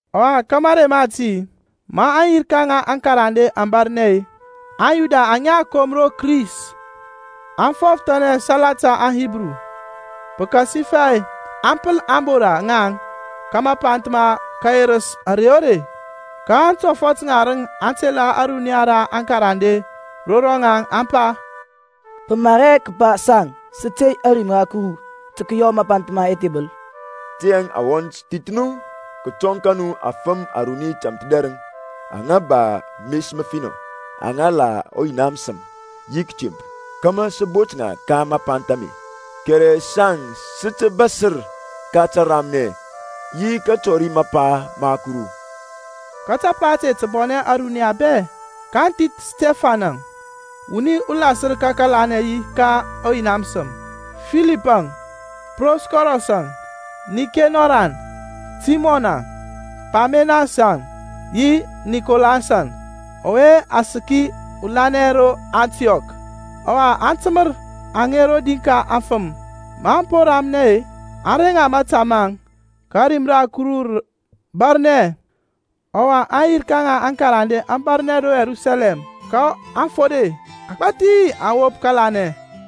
Ɔwa ka marey mati, ma aŋyirka ŋa aŋkarande aŋ bȧrnɛ-e, aŋYuda aŋa a kom ro Kris aŋ fɔfəthanɛ salata aŋHibru, pəkasifɛ a pəl ȧŋbora ŋaŋ ka mapanth ma kəyerəs ȧrey o rei. Ka antɔfɔt ŋarəŋ aŋ tela ȧruniya ra aŋkarande ro rɔŋaŋ, aŋ pa, Pə mar hɛ kəpa saŋ sə tey ȧrim ra Kuru tə kəyɔ mapanth ma ɛthebəl. Tiyȧŋ awɔnt, thith nu kətɔŋ ka nu afəm aruni tȧmthədɛrəŋ aŋa ba mes məfinɔ, aŋa la ɔYina məsəm yi kətemp, kȧmȧ sə bot ŋa ka mapanth ame. Kɛrɛ saŋ sə tə bȧsər ka təramnɛ yi ka kətɔri mapa ma Kuru. Ka tapa ȧte tə bɔnɛ ȧruniya bɛ, kaŋ thith Stifɛnȧŋ, wuni ulasər ka kəlanɛ yi ka ɔYina məsəm, Filipȧŋ, Prokɔrɔs-əŋ, Nikenɔrȧŋ, Timɔnȧŋ, Parmenasȧŋ yi Nikolasȧŋ, ɔwe a səki ulanɛ ro Antiɔk. Ɔwa aŋ təmər aŋe rodi ka aŋfəm; maŋ po ramnɛ-e, aŋ reŋ ŋa mȧta maŋ. Ka ȧrim ra Kuru rə bȧrnɛ, ɔwa aŋyirka ŋa aŋkarande aŋ bȧrnɛ ro Yerusalɛm, ka afode agbȧthi aŋ wop kȧlanɛ.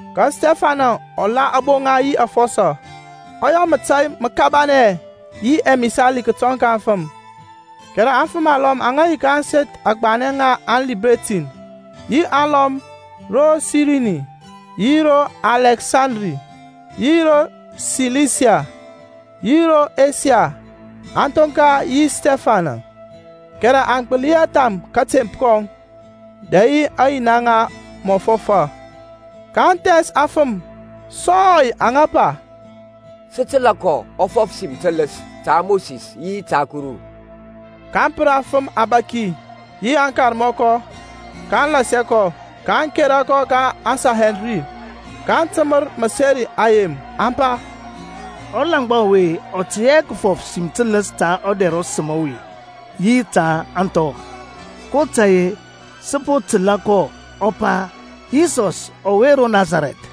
Ka Stifɛnȧŋ ɔ la aboŋa yi afɔsɔ, ɔ yɔ mȧtȧy məkabanɛ yi ɛmisali kətɔŋ ka aŋfəm. Kɛrɛ afəm alɔm aŋa yi ka ȧŋseth agbanɛ ŋa aŋLibertin, yi alɔm ro Sirini, yi ro Alɛksandri, yi ro Silisia, yi ro Esiya, aŋ thoŋka yi Stifɛnȧŋ. Kɛrɛ aŋ gbəli hɛ tham kȧtemp kɔŋ dɛ yi aŋyina aŋa mɔ fɔfa. kaŋ thɛns afəm sɔy aŋa pa, Sə təlȧ kɔ ɔ fɔf sim tələs ta Mosis yi ta Kuru. kaŋ pər aŋfəm yi aŋbȧki, yi aŋkarmɔkɔ, kaŋ lɛsa kɔ, aŋ kera kɔ ka aŋSanhedrin, kaŋ təmər məseri ayem aŋa pa, Ɔlaŋgba ɔwe ɔ tey hɛ kəfɔf sim tələs ta ɔdɛr ɔsəm ɔwe yi ta ȧŋthɔ; kotȧy-e, sə po təlȧ kɔ ɔ pa, Yisɔs ɔwe ro Nasarɛth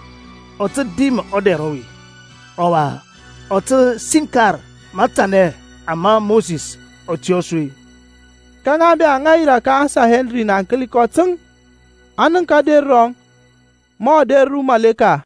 ɔ tə dim ɔdɛr ɔwe, ɔwa ɔ tə siŋkar matanɛ ama Mosis ɔ tiyȧ su. Ka ŋa bɛ aŋa yirȧ ka aŋSanhedrin aŋ kəli kɔ təŋ, aŋ nənk ader rɔŋ mɔ ader ra ɔmaleka.